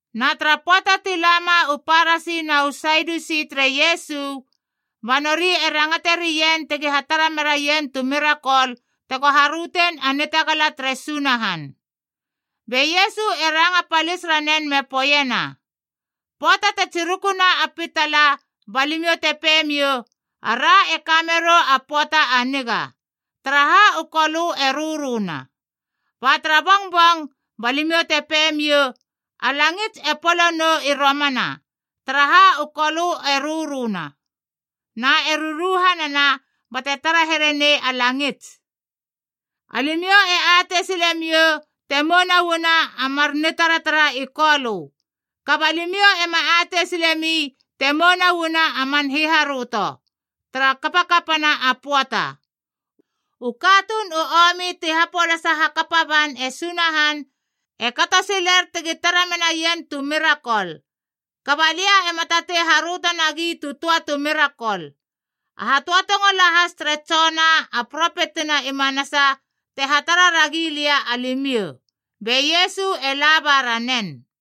Na tara pöata ti lama u Parasi na u Sadiusi tere Iesu. Ba nori e rangate rien tegi hatara meraien tu mirakol tego harötein a nitagala tere Sunahan. Be Iesu e ranga palis ranen me poeiena, “Pöata te tsirukuna a pitala ba limiou te pemiou, ‘Ara e ka merou a pöata a niga, taraha u kolö e röröna.’ Ba tara bongbong, ba limiou te pemiou, ‘A langits e polo nou i romana, taraha u kolö e röröna na e ruruhanana bate tara here nei a langits.’ Alimiou e atei silemiou te mouna uana a mar nitaratara i kolö. Kaba limiou ema atei silemi te mouna uana a man hiharöto tara kapakapana pöata. U katuun u omi ti hapolasa hakapa ban e Sunahan e kato siler tegi tara menaien tu mirakol. Kaba lia ema tatei haröto nagi tu töa tu mirakol. A hatöatongo lahas tere Jona a propetina i manasa te hatara ragi lia alimiou.” Be Iesu e la ba ranen.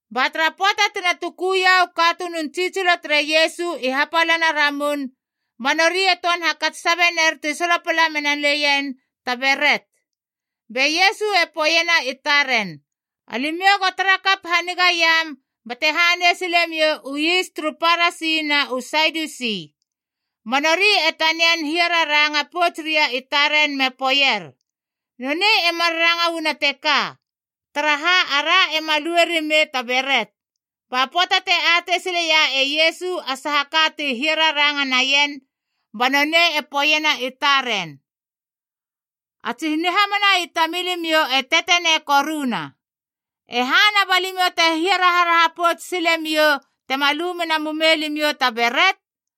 Ba tara pöata tina tukuia u katunun tsitsilo tere Iesu i hapalana Ramun, ba nori e töan hakats sabe ner ti solopala mena leien ta beret. Be Iesu e poeiena i taren, “Alimiou go tarakap hanigaiam bate hanei silemou u is turu Parasi na u Sadiusi.” Ba nori e tanian hiararanga pouts ria i taren me poeier, “Nonei e mar ranga uana teka, taraha ara ema lue rimei ta beret.” Ba pöata te atei sileia e Iesu a saha ka ti hiararanga naien, ba nonei e poeiena i taren, “A tsi nihamana i tamilimiou e tetenei koruna. E hana ba limiou te hiaraharaha pouts silemiou tema lu mena mumei limiou ta beret?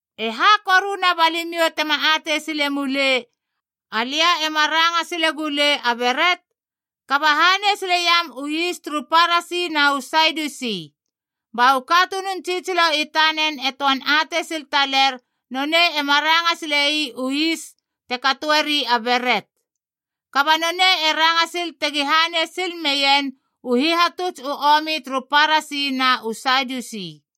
E ha koruna ba limiou tema atei sile mulei, alia ema ranga silegulei a beret? Kaba hanei sileiam u is turu Parasi na u Sadiusi!” Ba u katunun tsitsilo i tanen e töan atei sil taler nonei ema ranga silei u is te katoeri a beret, kaba nonei e ranga sil tegi hanei sil meien u hihatuts u omi turu Parasi na u Sadiusi.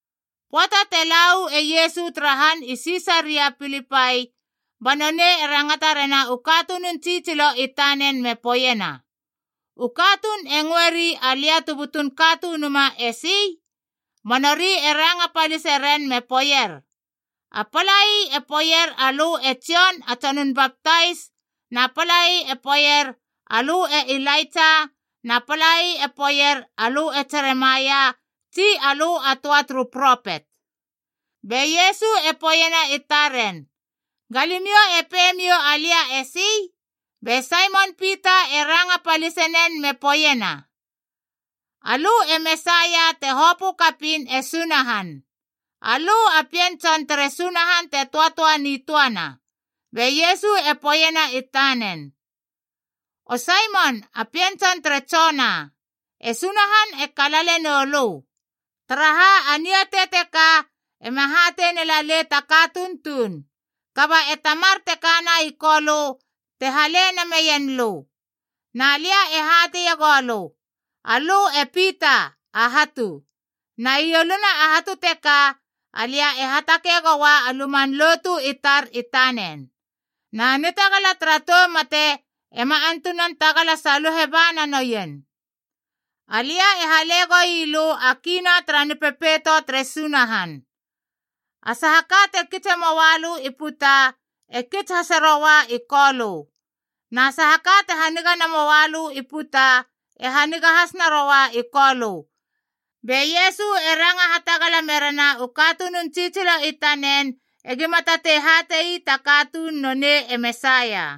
Pöata te la uu e Iesu tara han i Sisaria Pilipai, ba nonei e rangata rena u katunun tsitsilo i tanen me poeiena, “U katuun e ngöeri, Alia tu butun Katunuma, esi?” Ba nori e ranga palise ren me poeier, “A palai e poeier alö e Jon a Tsonun Baptais, na palai e poeier alö e Ilaitsa na palai e poeier alö e Jeremaia tsi alö a töa turu propet.” Be Iesu e poeiena taren, “Ga limiou e pemiou alia esi?” Be Saimon Pita e ranga palisenen me poeiena, “Alö e Mesaia te hopö kapiin e Sunahan. Alö a Pien Tson tere Sunahan te töatöa nitöana.” Be Iesu e poeiena i tanen, “O Saimon a pien tson tere Jona, e Sunahan e kalale noulö! Taraha a niatei teka ema hatei nelalei ta katuun tuun. Kaba e Tamar te kana i Kolö te hale nameien lö. Na lia e hateie goulö, alö e Pita, a hatu. Na ieluna a hatu teka alia e hatakeiegoa a luman lotu i tar i tanen. Na nitagala tara tou mate ema antunan tagala saluhe ba na nouien. Alia e hale goi lö a kii na tara Nipepeito tere Sunahan. A saha ka te kitse moalö i puta, e kits hase roa i Kolö. Na saha ka te haniga namoa lö i puta, e haniga has naroa i Kolö.” Be Iesu e ranga hatagala merena u katunun tsitsilo i tanen egima tatei hate ii ta katuun nonei e Mesaia.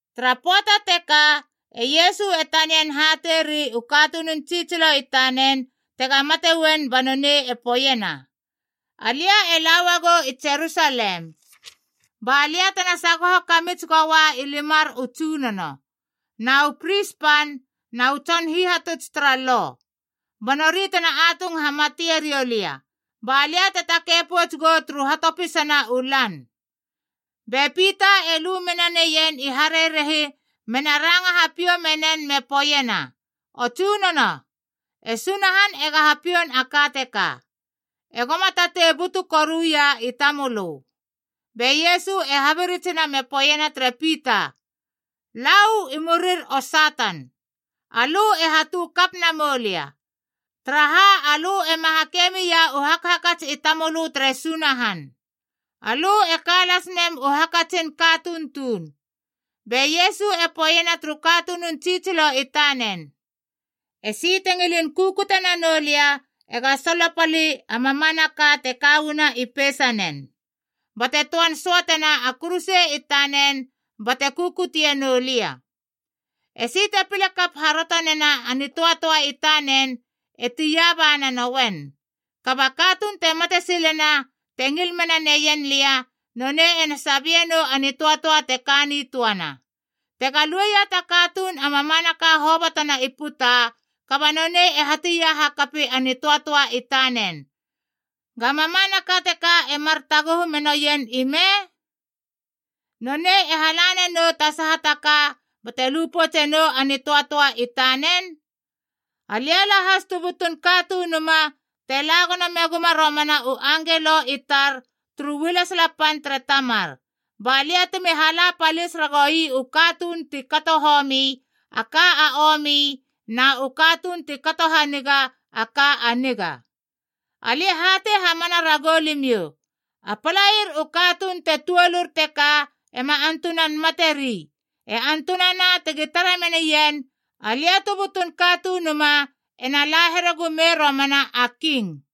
Tara pöata teka e Iesu e tanian hatei ri u katunun tsitsilo i tanen tega mate uen ba nonei e poeiena, “Alia e la uagou i Jerusalem balia tena sagoho kamits goa i limar u tsunono, na u pris pan, na u tson hihatuts tara Lo. Ba nori tena atung hamate riou lia, ba lia te takei pouts gou turu hatopisana u lan.” Be Pita e lu mena neien i harerehi mena ranga hapiou menen me poeiena, “O Tsunono, e Sunahan ega hapioun a ka teka! Ego ma tatei butu koruia i tamölö!” Be Iesu e habiritsina me poeiena tere Pita, “Lau i murir o Satan! Alö e hatu kap namou lia. Taraha alö ema hakei mia u hakhakats i tamölö tere Sunahan. Alö e ka lasmem u hakatsin a katuun tuun!” Be Iesu e poeiena turu katunun tsitsilo i tanen, “Esi te ngilin kukute nanou lia ega solopali a mamanaka te ka uana i peisanen, bate töan söatena a kuruse i tanen bate kukutie nou lia. Esi te pile kap haröto nena a nitöatöa i tanen e tia ba nanouen. Kaba a katuun te mate silena te ngil mena neien lia, nonei ena sabie nou a nitöatöa te ka nitöana. Tega lueia ta katuun a mamanaka hobotona i puta, kaba nonei e hatia hakapi a nitöatöa i tanen, ga mamanaka teka e mar taguhu menoien ime? Nonei e hala nanou ta saha ta ka bate lu poutse nou a nitöatöa i tanen? Alia lahas tu butun Katunuma te la gono meguma romana u angelo i tar turu ualesala pan tere Tamar, ba lia temi hala palis ragoui u katuun ti kato homi a ka a omi na u katuun ti kato haniga a ka a niga. Alia e hatei hamana ragou limiou, a palair u katuun te tuolur teka ema antunan materi, e antunana tegi tara menien Alia tu butun Katunuma ena la here gumei romana a king.”